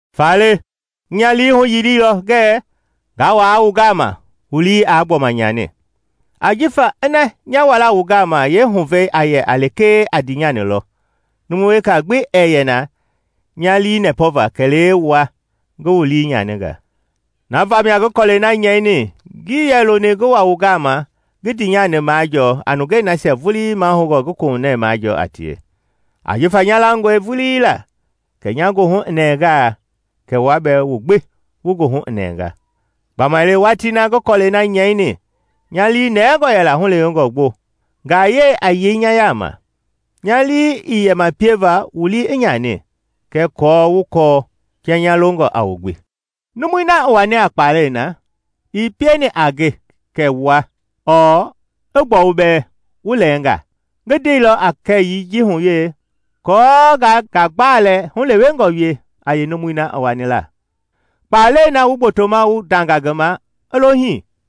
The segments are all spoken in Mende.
Faale ngi nya lii huyiliilɔ ngɛ ngaa wa wu gama wu lii aa gbɔma nyani. Ajifa ina nya wala wu gama yeehuvɛi a yɛ lekee a ndiinyani lɔ, numu weka gbi ɛɛ yɛ na nya lii nɛpɔva kɛlee wua ngi wu lii nyaninga. Na vamia ngi kɔlɛi na nyɛini ngii yɛ loni ngi wa wu gama ngi ndiinyani majɔɔ a nungei nasia vulii mahoungɔ ngi kohunɛ majɔɔ a tie. Ajifa nya langɔe vulii la kɛ nya goohu i nɛngaa, kɛ wua bɛɛ wu gbi wu goohu i nɛnga. Gbamaile watii na ngi kɔlɛi na nyɛini nya lii mɔnɛngɔ yɛla hulewengɔ gbo, ngayɛi a yei nya yaama; nya lii ii yɛ ma pieva wu lii i nyani, kɛɛ aako wu kɔɔ kia nya longɔ a wu gbi. Numui na i wani a kpalɛi na, ii pieni a nge kɛ wua ɔɔ, i gbɔu bɛɛ, wu lɛɛngaa. Ngi ndeilɔ a kɛyii ji hu we kɔɔ ngaa ngagbalɛ hulewengɔ wie a yeenumui na i wani la. Kpalɛi na wu gbotoma wu ndanga ngi ma i lo hii.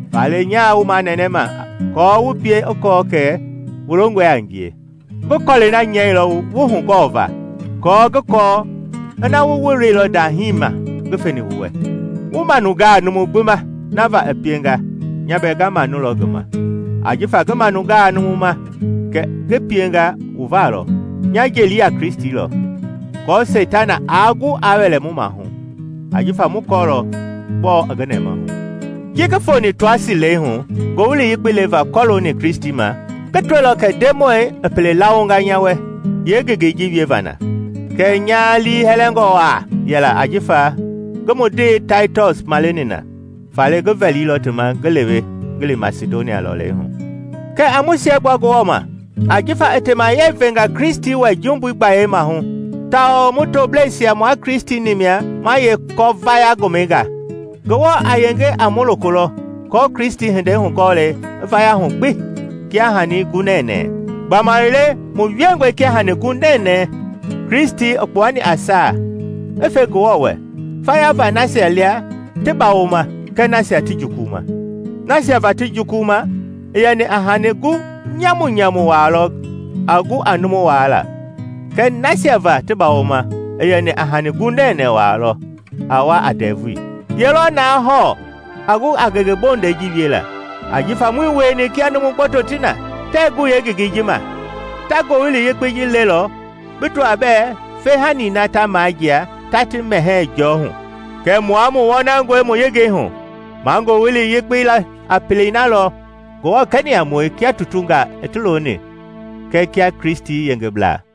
Faale nyaa wu manɛnɛma aako wu pie i kɔɔ kɛ wu longɔe a ngie. Ngi kɔlɛi na nyɛilɔ wu hugɔɔva aako ngi kɔɔ ina wu woloilɔ ndahii ma ngi feni wu wɛ. Wu manungaa numu gbi ma na va i pienga, nya bɛɛ nga manulɔ ngi ma. Ajifa ngi manungaa numu ma kɛ ngi pienga wu va lɔ, nya jeli a Kristi lɔ, aako Seitana aa gu aa wɛlɛ mu mahu; ajifa mu kɔɔlɔ gbɔɔ i ngi nɛmahu. Ji ngi foni Toasi leihu Ngowili Yekpei leva kɔloongɔ Kristi ma, ngi tɔilɔ kɛ Ndemɔi i pele lawonga nya wɛ yeengengei ji wieva na. Kɛɛ nya liihɛlɛngɔ waa yɛla ajifa ngii mu ndee Taitɔs maleni na. Faale ngi vɛlilɔ ti ma ngi lewe ngi li Masidonia lɔleihu. Kɛɛ a mu siɛgbua Ngewɔ ma! Ajifa i temayɛi venga Kristi wɛ jumbui gbayei maahu tawao mu toblɛisia mua Kristi-ni mia ma yeekɔ-vaya-gomɛi ga. Ngewɔ a yenge a mu loko lɔ kɔɔ Kristi hindei hugɔɔlei i vaya hu gbi kia hani gu nɛnɛɛ. Gbamaile mu wiengɔe kia hani gu nɛnɛɛ Kristi i kpuani a saa i fe Ngewɔ wɛ faya va nasia lia ti bawoma kɛɛ nasia ti jukuluma. Nasia va ti jukuluma, i yɛni a hani gu nyamunyamu waa lɔ a gu a numu waala; kɛɛ nasia va ti bawoma, i yɛni a hani gu nɛnɛɛ waa lɔ a wa a ndɛvui. Ye lɔ na hɔɔ a gu a ngenge bondɛi ji wiela? Ajifa muii wieni kia numu gboto ti na, tɛɛ gu yeengengei ji ma. Ta Ngowili Yekpei lelɔ bi tɔaa bɛɛ feehani na ta majia ta ti mɛhɛɛ jɔɔ hu. Kɛɛ mua mu wɔnangɔe mu yengei hu; ma Ngowili Yekpei le a pelei na lɔ Ngewɔ kɛni a mue kia tutungaa i ti loni kɛɛ kia Kristi yengeblaa.